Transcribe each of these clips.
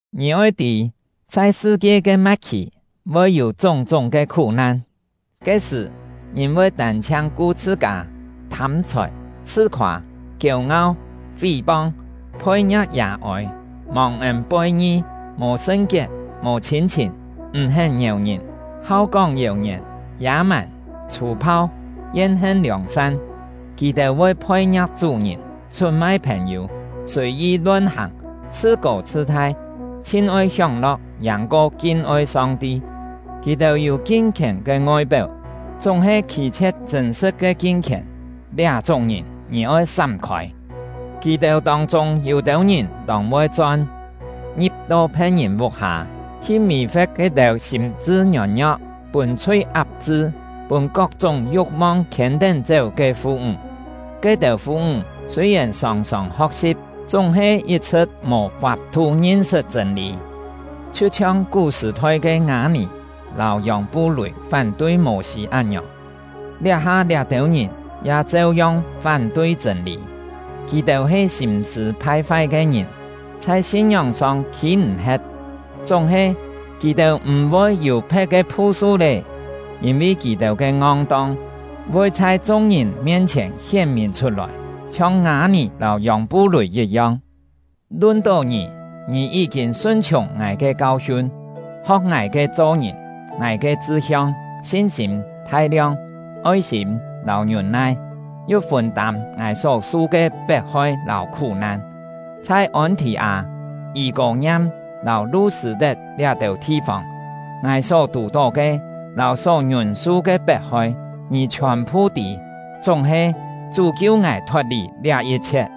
Ngì oi tî, chhai sṳ-kie ke ma̍t-khì voi yû chúng-chúng ke khú-nan. Ke-sṳ̀, ngìn voi tân-chhiang ku chhṳ-kâ, thâm-chhòi, chhṳ-khoâ, kiêu-ngau, fí-pong, phoi-ngia̍k yà-ôi, mòng-ên poi-ngi, mò sṳn-kiet, mò chhîn-chhìn, m̀-hén ngièu ngìn, hau kóng yèu-ngièn, yâ-màn, chhû-phau, yen-hen liòng-san. Kì-têu voi phoi-ngia̍k chú-ngìn, chhut-mai phèn-yû, sùi-yi lon-hàng, chhṳ-kô chhṳ-thai, chhin-oi hióng-lo̍k yàng-ko kin-oi Song-ti. Kì-têu yû kin-khièn ke ngoi-péu, chúng-he khî-chhie̍t chṳ̂n-sṳ̍t ke kin-khièn. Liá-chúng ngìn, ngì oi sám-khôi. Kì-têu tông-chûng yû-têu ngìn tông voi chon, ngi̍p-to phe̍t-ngìn vuk-hâ, hi mì-fe̍t ke-têu sîm-chṳ ngiôn-ngio̍k, pûn chhui ap-chṳ, pûn kok-chúng yu̍k-mong khiên-tén-chéu ke fu-ńg. Ke-têu fu-ńg sûi-yèn sòng-sòng ho̍k-si̍p, chúng-he yit-chhṳ̍t mò fap-thu ngin-sṳt chṳ̂n-lî. Chhiu-chhiong kú-sṳ̀-thoi ke Ngâ-nì lâu Yòng-pu-lùi fán-tui Mô-sî án-ngiòng, liá-ha liá-têu ngìn ya cheu-yong fán-tui chṳ̂n-lî. Kì-têu he sîm-sṳ̂ phai-fai ke ngìn, chhai sin-ngióng-song khî-m̀-he̍t. Chúng-he, kì-têu m̀-voi yû phe̍t ke phu-su lé; yîn-vi kì-têu ke ngong-tong voi chhai chung-ngìn mien-chhièn hién-mìn chhut-lòi, chhiong Ngâ-nì lâu Yòng-pu-lùi yit-yong. Lun-tó ngì, ngì yí-kîn sun-chhiùng ngài ke kau-hiun, ho̍k ngài ke cho-ngìn, ngài ke chṳ-hiong, sin-sîm, thai-liong, oi-sîm, lâu ngiûn-nai, yu fûn-tâm ngài só-su ke pet-hoi lâu khú-nan. Chhai Ôn-thì-â, Yî-kô-ngiam, lâu Lu-sṳ̂-tet liá-têu thi-fông, ngài só tù-tó ke lâu só ngiûn-su ke pet-hoi, ngì chhiòn-phu tî; chúng-he, Chú kiu ngài thot-lì liá yit-chhiet.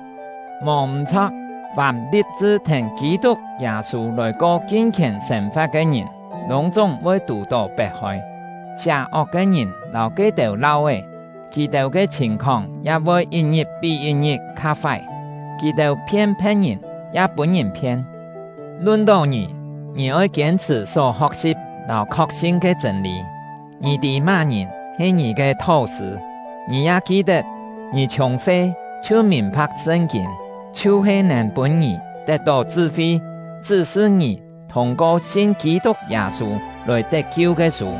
Mò m̀-chho̍k, fàm li̍p-chṳ thèn Kî-tuk Yâ-sû lòi ko kin-khièn sên-fa̍t ke ngìn, lûng-chúng voi tù-tó pet-hoi. Sià-ok ke ngìn lâu ke-têu lau-é, kì-têu ke chhìn-khóng ya voi yit-ngit pí yit-ngit kha fái; kì-têu phien phe̍t-ngìn, ya pûn-ngìn phien. Lun-tó ngì, ngì oi kiên-chhṳ̀ só ho̍k-si̍p lâu khok-sin ke chṳ̂n-lî. Ngì tî má-ngìn he ngì ke thó-sṳ̂; ngì ya ki-tet, ngì chhiùng-se chhiu mìn-pha̍k Sṳn-kîn, chhiu-he nèn pûn ngì tet-tó chṳ-fi, chṳ́-sṳ ngì thûng-ko sin Kî-tuk Yâ-sû lòi tet-kiu ke sû.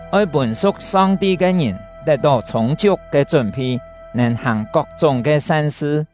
oi pûn su̍k Song-ti ke ngìn tet-tó chhûng-chiuk ke chún-phi, nèn hàng kok-chúng ke san-sṳ.